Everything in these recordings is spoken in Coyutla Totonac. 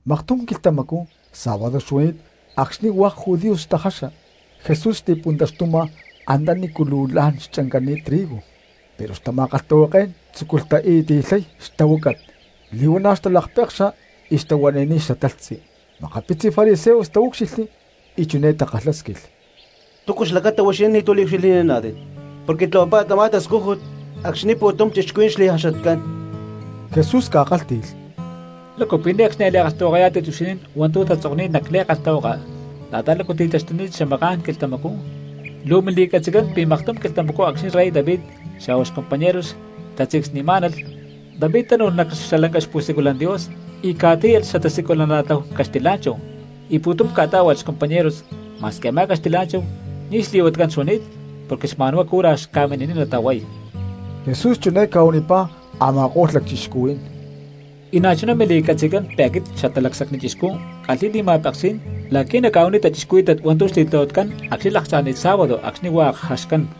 Maktum quilhtamacú sábado xuani̠t acxni̠ hua̠k judíos xtajaxa, Jesús xti̠puntaxtuma antanícu luu la̠n xchancani̠t trigo, pero xtama̠kalhtahuaké̠n tzúculh tai̠ti̠lhay xtahuácat, li̠huana̠ xtalakpekxa y xtahuani̠niy xatalhtzi. Makapitzi fariseos taúcxilhli y chiné takalhásquilh: —¿Túcu xlacata huixinín ni̠tu̠cu liucxilhni̠naná̠tit porque tlahuapá̠tit tamá tascújut acxni̠ pu̠tum cristianos xli̠jaxatcán? Jesús ca̠kálhti̠lh: —¿Lácu pi̠ ne̠cxni a̠ li̠kalhtahuakayá̠tit huixinín hua̠ntu̠ tatzokni̠t nac li̠kalhtahuaka la̠ta lácu ti̠taxtuni̠t xamaká̠n quilhtamacú, luu mili̠catzi̠tcán pi̠ maktum quilhtamacú acxni̠ rey David xa̠hua xcompañeros xtatzincsni̠má̠nalh, David xlá tánu̠lh nac lanca xpu̠siculan Dios y ca̠tíyalh xatasiculana̠tláhu caxtilá̠nchahu y pu̠tum ca̠tá̠hualh xcompañeros ma̠squi a̠má caxtilá̠nchahu ni̠ xli̠huatcán xuani̠t porque xma̠nhuá cura xca̠mini̠niy natahuay? Jesús chiné ca̠huanipá a̠ma̠ko̠lh lacchixcuhuí̠n: —Y na̠chuná mili̠catzi̠tcán pi̠ aquit Xatalacsacni Chixcú ckalhi̠y li̠ma̠peksí̠n la̠qui̠ nacca̠huaniy cristianos hua̠ntu̠ xli̠tlahuatcán acxni̠ lakcha̠ni̠t sábado acxni̠ hua̠k jaxcán.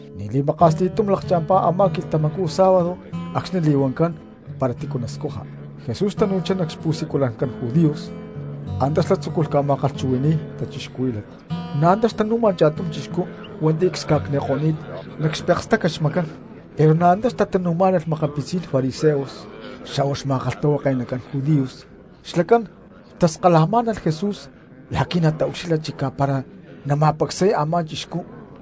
Ni̠ xli̠maka̠s li̠túm lakcha̠mpá a̠má quilhtamacú sábado acxni̠ xli̠huancán para tícu nascuja, Jesús tanu̠chá nac xpu̠siculancán judíos, antá xlá tzúculh ca̠ma̠kalhchuhui̠ni̠y cristianos. Na̠ antá xtanu̠ma cha̠tum chixcú hua̠nti̠ csca̠cniko̠ni̠t nac xastácat xmacán. Pero na̠ antá xtanu̠má̠nalh makapitzí̠n fariseos xa̠hua xma̠kalhtahuake̠nacán judíos xlacán xtaskalajmá̠nalh Jesús la̠qui̠ nataucxilha chicá para nama̠pacsay a̠má chixcú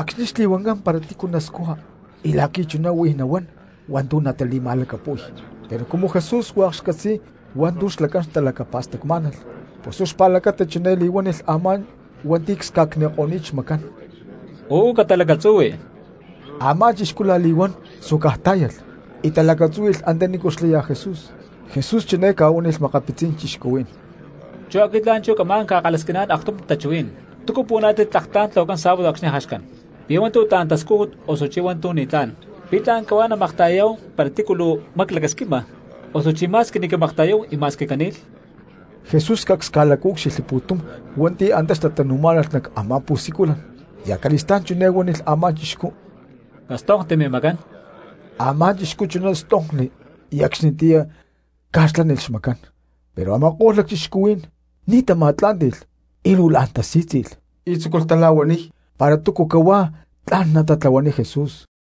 acxni̠ xli̠huancán para tícu nascuja y la̠qui̠ chuná huijá nahuán hua̠ntu̠ natali̠ma̠lacapu̠y. Pero cumu Jesús hua̠k xcatzi̠y hua̠ntu̠ xlacán xtalacapa̠stacmá̠nalh pus huá xpa̠lacata chiné li̠huánilh a̠má hua̠nti̠ csca̠cniko̠ni̠t xmacán: —¡Uú catalacatzuhui! Amá chixcú la̠li̠huán suácaj tá̠yalh y talacatzúhui̠lh antanícu xlaya Jesús. Jesús chiné ca̠huánilh makapitzí̠n cristianos: —Chú aquit la̠nchú camá̠n ca̠kalhasquiná̠n aktum tachuhuí̠n: ¿Túcu puhuaná̠tit tlak tla̠n tlahuacán sábado acxni̠ jaxcán? ¿Pi̠ hua̠ntu̠ tla̠n tascújut, osuchí hua̠ntu̠ ni̠tlá̠n? ¿Pi̠ tla̠n cahuá namakta̠yayá̠hu para tícu luu maclacasquixni̠ma, osuchí ma̠squi ni̠ camakta̠yáhu y ma̠squi cani̠lh? Jesús cacs ca̠lacaúcxilhli pu̠tum hua̠nti̠ antá xtatanu̠má̠nalh nac a̠má pu̠siculan, y acali̠stá̠n chiné huánilh a̠má chixcú: —Castonkti mimacán. Amá chixcú chuná stonkli, y acxnitiyá ca̠xlaní̠nilh xmacán. Pero a̠ma̠ko̠lh lacchixcuhuí̠n ni̠ tama̠tlá̠nti̠lh y luu la̠n tasí̠tzi̠lh y tzúculh tala̠huaniy para túcu cahuá tla̠n natatlahuaniy Jesús.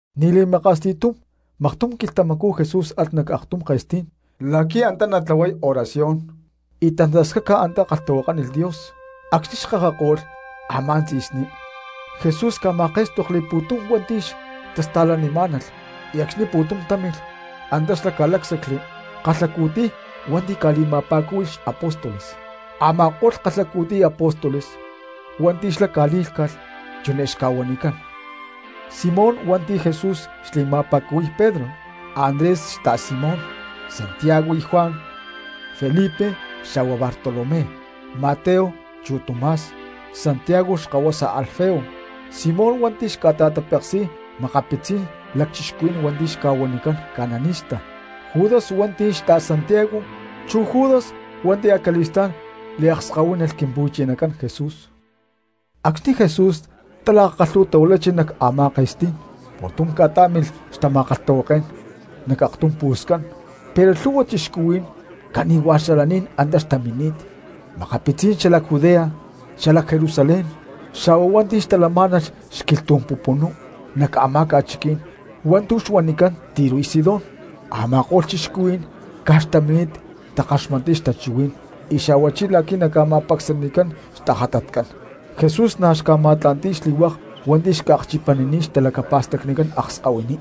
Ni̠ li̠maka̠s li̠túm maktum quilhtamacú Jesús alh nac aktum ke̠stí̠n la̠qui̠ antá natlahuay oración, y tantascaca antá kalhtahuakánilh Dios. Acxni̠ xkakako̠lh a̠má tzi̠sní Jesús ca̠ma̠ké̠stokli pu̠tum hua̠nti̠ xtasta̠lanimá̠nalh y acxni̠ pu̠tum támilh antá xlá ca̠lácsacli kalhacu̠tiy hua̠nti̠ ca̠li̠ma̠pa̠cúhui̠lh xapóstoles. Ama̠ko̠lh kalhacu̠tiy apóstoles hua̠nti̠ xlá ca̠lí̠lhca̠lh chiné xca̠huanicán: Simón hua̠nti̠ Jesús li̠ma̠pa̠cúhui̠lh Pedro; Andrés xta̠Simón; Santiago y Juan; Felipe xa̠hua Bartolomé; Mateo chu Tomás; Santiago xkahuasa Alfeo; Simón hua̠nti̠ xca̠ta̠tapeksi̠y makapitzí̠n lacchixcuhuí̠n xca̠huanicán cananistas; Judas hua̠nti̠ xta̠Santiago; chu Judas hua̠nti̠ acali̠stá̠n liakskahuínalh Quimpu̠chinacán Jesús. Acxni̠ Jesús talakakalhu̠tahuilachi nac a̠má ke̠stí̠n, pu̠tum ca̠tá̠milh xtama̠kalhtahuaké̠n nac aktum pu̠scan, pero lhu̠hua cristianos cani̠hua̠ xalaní̠n antá xtamini̠t: makapitzí̠n xalac Judea, xalac Jerusalén, xa̠hua hua̠nti̠ xtalamá̠nalh xquilhtú̠n pupunú nac a̠má ca̠chiquí̠n hua̠ntu̠ xca̠huanicán Tiro y Sidón. Ama̠ko̠lh cristianos caj xtamini̠t takaxmatniy xtachuhuí̠n y xa̠huachí la̠qui̠ naca̠ma̠pacsanicán xtajatatcán. Jesús na̠ xca̠ma̠tla̠nti̠y xli̠hua̠k hua̠nti̠ xca̠akchipanini̠t xtalacapa̠stacnicán akskahuiní.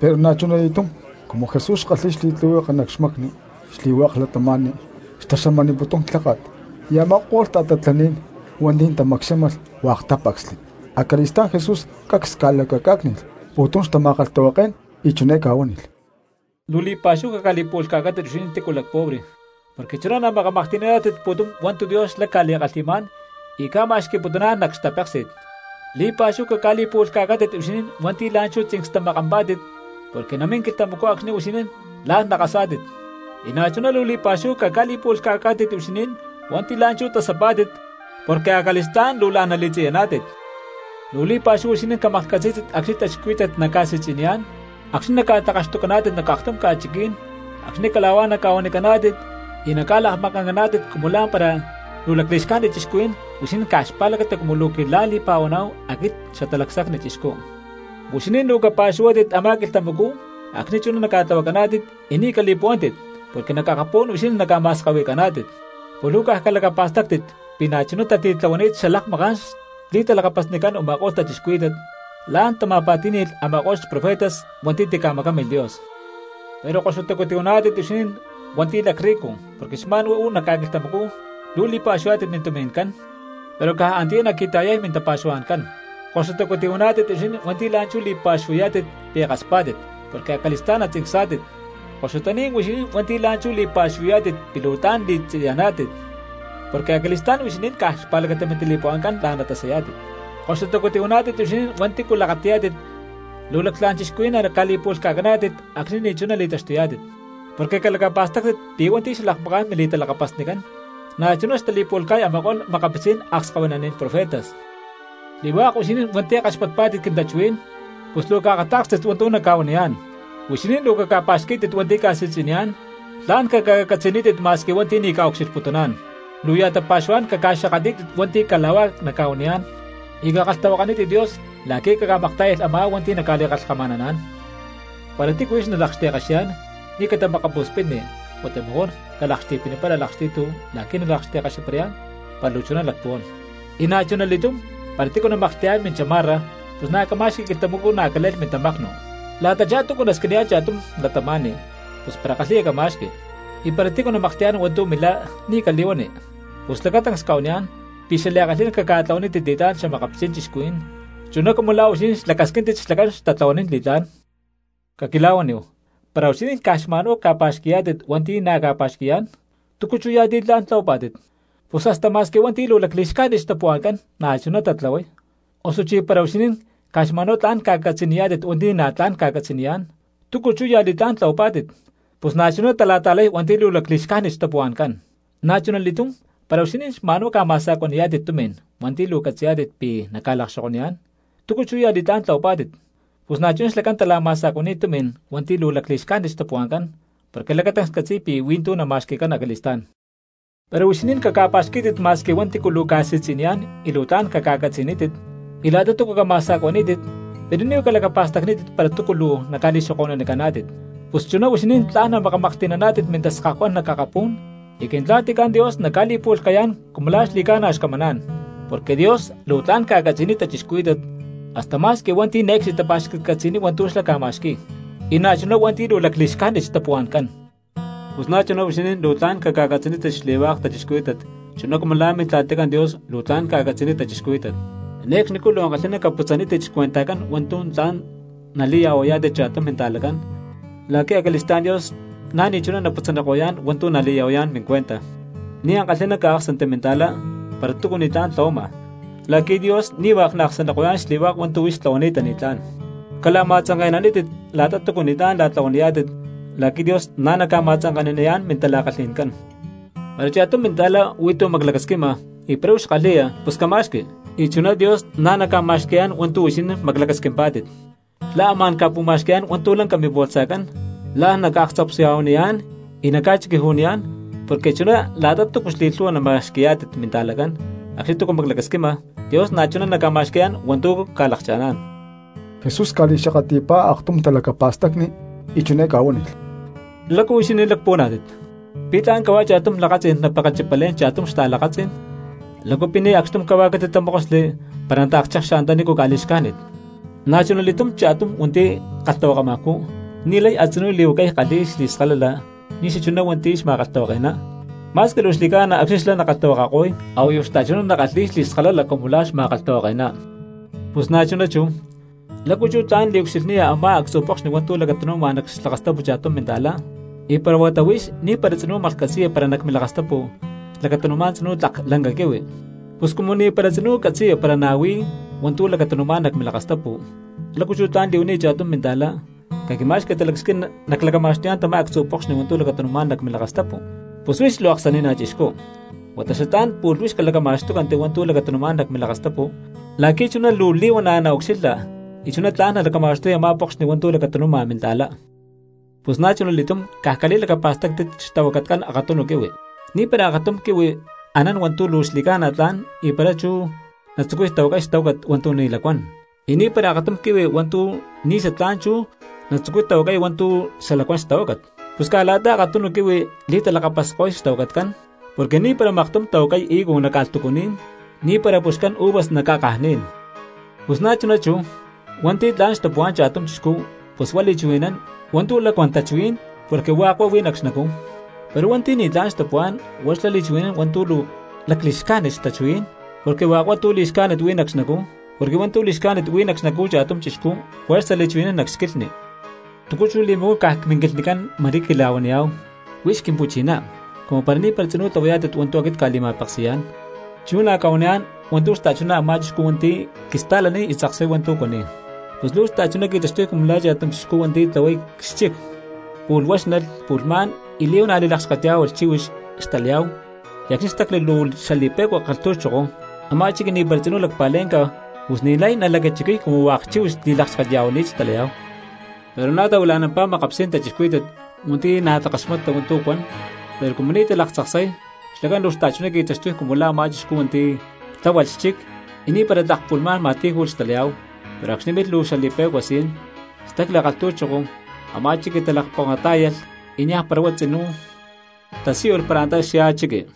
Pero na̠chuna li̠túm cumu Jesús xkalhi̠y li̠tlihueke nac xmacni xli̠hua̠k cristianos xtaxamaniputún clháka̠t, y a̠ma̠ko̠lh ta̠tatlaní̠n hua̠nti̠ tamacxámalh hua̠k tápacsli. Acali̠stá̠n Jesús cacs ca̠lacacá̠cni̠lh pu̠tum xtama̠kalhtahuaké̠n y chiné ca̠huánilh: —Luu li̠pa̠xúhu caca̠li̠pu̠lhca̠cántit huixinín hua̠nti̠cu lacpobre porque chuná namakamaklhti̠naná̠tit pu̠tum hua̠ntu̠ Dios xlá ca̠li̠kalhi̠má̠n y ca̠ma̠xqui̠putuná̠n nac xtapéksi̠t. ’Li̠pa̠xúhu caca̠li̠pu̠lhca̠cántit huixinín hua̠nti̠ la̠nchú tzincstamakampá̠tit porque namín quilhtamacú acxni̠ huixinín la̠n nakasá̠tit. ’Y na̠chuná luu li̠pa̠xúhu caca̠li̠pu̠lhca̠cántit huixinín hua̠nti̠ la̠nchú tasapá̠tit porque acali̠stá̠n luu la̠n nali̠tziyaná̠tit. ’Luu li̠pa̠xúhu huixinín camaklhcatzí̠tit acxni̠ cristianos naca̠si̠tzi̠niyá̠n, acxni̠ luu naca̠tlakaxtucaná̠tit nac aktum ca̠chiquí̠n, acxni̠ cala̠huá naca̠huanicaná̠tit y naca̠lakmakancaná̠tit cumu lá̠mpara hua̠nti̠ luu lacli̠xcájnit cristianos huixinín caj xpa̠lacata cumu luu quila̠li̠pa̠huaná̠hu aquit Xatalacsacni Chixcú. Huixinín luu capa̠xuhuátit a̠má quilhtamacú acxni̠ chuná naca̠tlahuacaná̠tit y ni̠ cali̠puhuántit, porque nac akapú̠n huixinín naca̠ma̠skahui̠caná̠tit; pus luu caj calacapa̠stáctit pi̠ na̠chuná tatitlahuani̠t xalakmaká̠n xli̠talakapasnicán u̠ma̠ko̠lh cristianos, la̠n tama̠pa̠tí̠ni̠lh a̠ma̠ko̠lh profetas hua̠nti̠ tica̠macámilh Dios. ’Pero koxutacu tihuaná̠tit huixinín hua̠nti̠ lacrricu porque xma̠n huá uú nac ca̠quilhtamacú tla̠n luu li̠pa̠xuhuayá̠tit mintumi̠ncán, pero caj antiyá naqui̠ta̠yay mintapa̠xuhua̠ncán. ’Koxutacu tihuaná̠tit huixinín hua̠nti̠ la̠nchú li̠pa̠xuhuayá̠tit pi̠ kaspá̠tit porque acali̠stá̠n natzincsá̠tit. ’Koxutaní̠n huixinín hua̠nti̠ la̠nchú li̠pa̠xuhuayá̠tit pi̠ luu tla̠n li̠tziyaná̠tit porque acali̠stá̠n huixinín caj xpa̠lacata mintali̠puhua̠ncán la̠n natasayá̠tit. ’Koxutacu tihuaná̠tit huixinín hua̠nti̠cu lakati̠yá̠tit hua̠k luu lactlá̠n cristianos naca̠li̠pu̠lhca̠caná̠tit acxni̠ ni̠chuná li̠taxtuyá̠tit, porque calacapa̠stáctit pi̠ hua̠nti̠ xalakmaká̠n mili̠talakapasnicán na̠chuná xtali̠pu̠lhca̠y a̠ma̠ko̠lh makapitzí̠n akskahuinaní̠n profetas. ’Xli̠hua̠k huixinín hua̠nti̠ kaxpatpá̠tit quintachuhuí̠n pus luu caakatá̠kstit hua̠ntu̠ nacca̠huaniyá̠n: Huixinín luu caca̠pa̠xquí̠tit hua̠nti̠ ca̠si̠tzi̠niyá̠n, tla̠n caca̠catzi̠nítit ma̠squi hua̠nti̠ ni̠ naca̠ucxilhputuná̠n. Luu ya̠ tapa̠xuhuá̠n caca̠xakatlí̠tit hua̠nti̠ cala̠huá naca̠huaniyá̠n y cakalhtahuakanítit Dios la̠qui̠ camaktá̠yalh a̠má hua̠nti̠ naca̠li̠kalhkama̠naná̠n. Para tícu huix nalakxti̠kaxiyá̠n ni̠ catamakapu̠spitni huata mejor calakxti̠pinipara a̠lakxti̠tu la̠qui̠ nalakxti̠kaxiparayá̠n para luu chuná lacpuhuán. Y na̠chuna li̠túm para tícu namaklhti̠yá̠n minchamarra pus na̠ cama̠xqui quilhtamacú na̠ cale̠lh mintamaknu. La̠tachá túcu nasquiniyá̠n cha̠tum cristiano, pus para kalhi̠ya cama̠xqui; y para tícu namaklhti̠yá̠n hua̠ntu̠ milá ni̠ cali̠huani. Pus lacatancs cca̠huaniyá̠n pi̠ xliankalhi̠ná caca̠tlahuanítit li̠tlá̠n xa̠makapitzí̠n cristianos chuná cumu la̠ huixinín xlacasquíntit xlacán xtatlahuanín li̠tlá̠n. ’Caquila̠huaníhu, para huixinín caj xma̠nhuá ca̠pa̠xqui̠yá̠tit hua̠nti̠ na̠ ca̠pa̠xqui̠yá̠n, ¿túcu chú ya̠ li̠tlá̠n tlahuapá̠tit? Pus hasta ma̠squi hua̠nti̠ luu lacli̠xcájnit xtapuhua̠ncán na̠chuná tatlahuay. Osuchí para huixinín caj xma̠nhuá tlán ca̠catzi̠niyá̠tit hua̠nti̠ na̠ tla̠n ca̠catzi̠niyá̠n, ¿túcu chú ya̠ li̠tlá̠n tlahuapá̠tit? Pus na̠chuná tala̠ta̠lay hua̠nti̠ luu lacli̠xcájnit xtapuhua̠ncán. Na̠chunali̠túm para huixinín xma̠nhuá ca̠ma̠sa̠cuani̠yá̠tit tumi̠n hua̠nti̠ luu catzi̠niyá̠tit pi̠ naca̠lakaxokoniyá̠n, ¿túcu chú ya̠ li̠tlá̠n tlahuapá̠tit? Pus na̠chuná xlacán tala̠ma̠sa̠cuani̠y tumi̠n hua̠nti̠ luu lacli̠xcájnit xtapúhua̠ncán porque lacatancs catzi̠y pi̠ hui̠ntú nama̠xqui̠cán acali̠stá̠n. Pero huixinín caca̠pa̠xquí̠tit ma̠squi hua̠nti̠cu luu ca̠si̠tzi̠niyá̠n y luu tla̠n caca̠catzi̠nítit, y la̠ta túcu cama̠sa̠cuaní̠tit pero ni̠ huá calacapa̠stacnítit para túcu luu naca̠li̠xoko̠nunicaná̠tit. Pus chuná huixinín tla̠n namakamaklhti̠naná̠tit mintaskahucán nac akapú̠n, y Quintla̠ticán Dios naca̠li̠pu̠lhca̠yá̠n cumu la̠ xli̠ca̠na xcamaná̠n. Porque Dios luu tla̠n ca̠catzi̠niy cristianos hasta ma̠squi hua̠nti̠ ne̠cxni tapa̠xcatcatzi̠niy hua̠ntu̠ xlá ca̠ma̠xqui̠y, y na̠chuná hua̠nti̠ luu lacli̠xcájnit xtapuhua̠ncán. Pus na̠chuná huixinín luu tla̠n caca̠catzi̠nítit xli̠hua̠k cristianos chuná cumu la̠ Mintla̠ticán Dios luu tla̠n ca̠catzi̠niy cristianos. ’Ne̠cxnicú luu ankalhi̠ná caputzanítit xcuentajcán hua̠ntu̠ tla̠n nali̠ya̠huayá̠tit cha̠tum minta̠cristiano la̠qui̠ acali̠stá̠n Dios na̠ ni̠chuná naputzaniko̠yá̠n hua̠ntu̠ nali̠ya̠huayá̠n mincuenta. Ni̠ ankalhi̠ná caáksanti minta̠cristiano para túcu ni̠tlá̠n tlahuama, la̠qui̠ Dios ni̠ hua̠k naaksaniko̠yá̠n xli̠hua̠k hua̠ntu̠ huix tlahuani̠ta ni̠tlá̠n. Cala̠ma̠tzanke̠nanítit la̠ta túcu ni̠tlá̠n la̠tlahuaniyá̠tit la̠qui̠ Dios na̠ naca̠ma̠tzanke̠naniyá̠n mintala̠kalhi̠ncán. Para cha̠tum minta̠cristianojcán huí tu̠ maclacasquima y para huix kalhi̠ya pus cama̠xqui, y chuná Dios na̠ naca̠ma̠xqui̠yá̠n hua̠ntu̠ huixinín maclacasquimpá̠tit. Xlá amá̠n ca̠pu̠ma̠xqui̠yá̠n hua̠ntu̠ lanca mimbolsajcán, la̠n naca̠akatzapsya̠huaniyá̠n y naca̠chiquiju̠niyá̠n, porque chuná la̠ta túcu xli̠lhu̠hua nama̠xqui̠yá̠tit minta̠cristianojcán acxni̠ túcu maclacasquima, Dios na̠chuná naca̠ma̠xqui̠yá̠n hua̠ntu̠ ca̠lakcha̠ná̠n. Jesús ca̠li̠xakatli̠pá aktum talacapa̠stacni y chiné ca̠huánilh: —¿Lácu huixinín lacpuhuaná̠tit? ¿Pi̠ tla̠n cahuá cha̠tum lakatzí̠n napekechipalé̠n cha̠tum xta̠lakatzí̠n? ¿Lácu pi̠ ni̠ acxtum cahuá catitatamókosli para nataakchekxa antanícu ca̠li̠xcájnit? Na̠chunali̠túm cha̠tum hua̠nti̠ kalhtahuakamajcú ni̠lay a̠tzinú li̠huacay kalhi̠y xli̠skalala ni̠ xachuná hua̠nti̠ xma̠kalhtahuake̠ná, ma̠squi luu xli̠ca̠na acxni̠ xlá nakalhtahuakako̠y a̠huayu xta̠chuná nakalhi̠y xli̠skalala cumu la̠ xma̠kalhtahuake̠ná. ’Pus na̠chuná chú, ¿lácu chú tla̠n liucxilhniya a̠má actzu̠ pokxni hua̠ntu̠ lacatanu̠ma nac xlakastapu cha̠tum minta̠cristiano y para huata huix ni̠para tzinú maklhcatzi̠ya para nac milakastapu lacatanu̠má̠n tzinú tlak lanca quihui? Pus cumu ni̠para tzinú catzi̠ya para na̠ huí hua̠ntu̠ lacatanu̠má̠n nac milakastapu, ¿lácu chú tla̠n li̠huaniya cha̠tum minta̠cristiano: “Caquima̠xqui talacasquín naclacama̠xtuyá̠n tamá actzu̠ pokxni hua̠ntu̠ lacatanu̠má̠n nac milakastapu”? ¡Pus huix luu aksani̠ná chixcú! Huata xatlá̠n pu̠lh huix calacama̠xtúcanti hua̠ntu̠ lacatanu̠má̠n nac milakastapu la̠qui̠ chuná luu li̠huana̠ naucxilha y chuná tla̠n nalacama̠xtuya a̠má pokxni hua̠ntu̠ lacatanu̠ma minta̠cristiano. ’Pus na̠chuna li̠túm caj cali̠lacapa̠stáctit xtahuacatcán akatunu quihui: ni̠para akatum quihui anán hua̠ntu̠ luu xli̠ca̠na tla̠n y para chú natzucuy tahuacay xtahuácat hua̠ntu̠ ni̠ lacuán; y ni̠para akatum quihui hua̠ntu̠ ni̠ xatlá̠n chú natzucuy tahuacay hua̠ntu̠ luu xalacuán xtahuácat. Pus caj la̠ta akatunu quihui li̠talakapasko̠y xtahuacatcán; porque ni̠para maktum tahuacay higo nac ca̠lhtucuní̠n, ni̠para ca̠puxcán uvas nac ca̠kajní̠n. Pus na̠chuná chú cristianos: hua̠nti̠ tla̠n xtapuhuá̠n cha̠tum chixcú pus huá li̠chuhui̠nán hua̠ntu̠ lacuán tachuhuí̠n porque hua̠k huá huí nac xnacú; pero hua̠nti̠ ni̠tlá̠n xtapuhuá̠n huá xlá li̠chuhui̠nán hua̠ntu̠ luu lacli̠xcájnit xtachuhuí̠n porque hua̠k huá tu̠ li̠xcájnit huí nac xnacú. Porque hua̠ntu̠ li̠xcájnit huí nac xnacú cha̠tum chixcú juerza nali̠chuhui̠nán nac xquilhni. ’¿Túcu chú li̠macuán caj minquilhnicán ma̠rí quila̠huaniyá̠hu, “Huix Quimpu̠chiná”, cumu para ni̠para tzinú tlahuayá̠tit hua̠ntu̠ aquit cca̠li̠ma̠peksi̠yá̠n? Chú nacca̠huaniyá̠n hua̠ntu̠ xta̠chuná a̠má chixcú hua̠nti̠ quista̠laniy y tzaksay hua̠ntu̠ cuaniy: pus luu xta̠chuná qui̠taxtuy cumu la̠ cha̠tum chixcú hua̠nti̠ tlahuay xchic, pu̠lh huáxnalh pu̠lhmá̠n y li̠huana̠ li̠lakxketyá̠hualh chíhuix xtalayá̠hu y acxni̠ stacli luu xali̠pe̠cua kalhtu̠choko a̠má chiqui ni̠para tzinú lacpa̠lé̠nca, pus ni̠lay nalacachiquiy cumu hua̠k chíhuix xli̠lakxtekya̠huani̠t xtalayá̠hu. Pero na̠ tahuila̠nampá makapitzí̠n cristianos hua̠nti̠ na̠ takaxmata hua̠ntu̠ cuan pero cumu ni̠ talaktzaksay, xlacán luu xta̠chuná qui̠taxtuy cumu la̠ a̠má chixcú hua̠nti̠ tláhualh xchic y ni̠para tlak pu̠lhmá̠n ma̠tí̠ju̠lh xtalayá̠hu, pero acxni̠ milh luu xali̠pe̠cua si̠n, stacli kalhtu̠choko a̠má chiqui talakponkatá̠yalh y niaj para huá tzinú tasíyulh para antá xyá chiqui.